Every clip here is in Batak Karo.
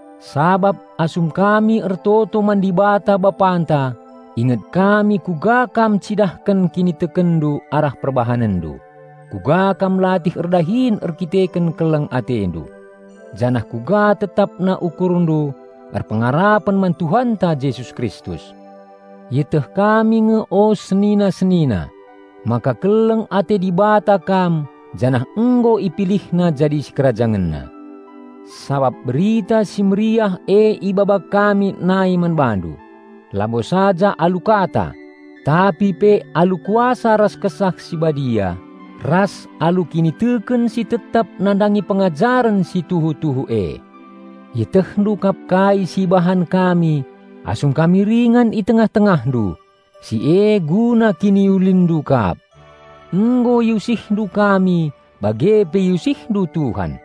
Sabap asum kami ertoto man Dibata Bapanta inget kami kuga kam ncidahken kinitekenndu arah perbahanenndu, kuga kam latih erdahin erdandanken keleng atendu, janah kuga tetapna ukurndu erpengarapen man Tuhanta Jesus Kristus. Ieteh kami nge o senina-senina, maka keleng ate Dibata kam janah nggo IpilihNa jadi SikerajangenNa. Sabap Berita Si Mehuli e ibaba kami nai man bandu, labo saja alu kata, tapi pe alu kuasa ras Kesah Si Badia, ras alu kiniteken si tetap nandangi pengajaren si tuhu-tuhu e. Ietehndu kap kai si ibahan kami asum kami ringan i tengah-tengahndu; si e guna kiniulinndu kap. Nggo iusihndu kami bage pe iusihndu Tuhan.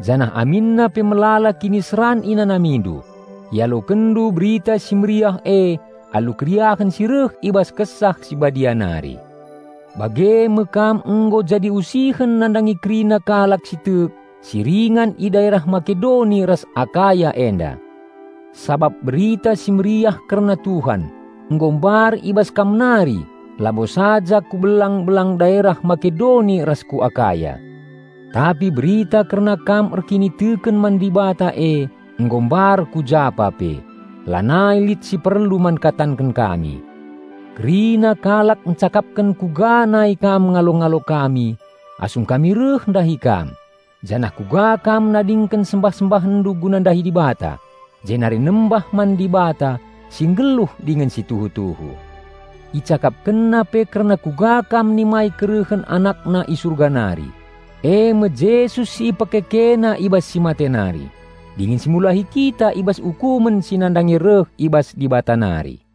Janah aminna pe melala kiniseran inanamindu, ialokenndu Berita Si Mehuli e alu keriahen si reh i bas Kesah Si Badia nari. Bage me kam nggo jadi usihen nandangi kerina kalak si tek si ringan i daerah Makedoni ras Akaya enda. Sabap Berita Si Mehuli kerna Tuhan nggo mbar i bas kam nari labo saja ku belang-belang daerah Makedoni ras ku Akaya, tapi berita kerna kam erkiniteken man Dibata e nggo mbar ku japa pe. Lanai lit si perlu man katanken kami. Kerina kalak ncakapken kuga nai kam ngalo-ngalo kami asum kami reh ndahi kam, janah kuga kam nadingken sembah-sembahenndu guna ndahi Dibata, jenari nembah man Dibata si nggeluh dingen si tuhu-tuhu. Icakapkenna pe kerna kuga kam nimai kerehen AnakNa i Surga nari, e me Jesus si IpekekeNa i bas si mate nari, dingen si mulahi kita i bas ukumen si nandangi reh i bas Dibata nari.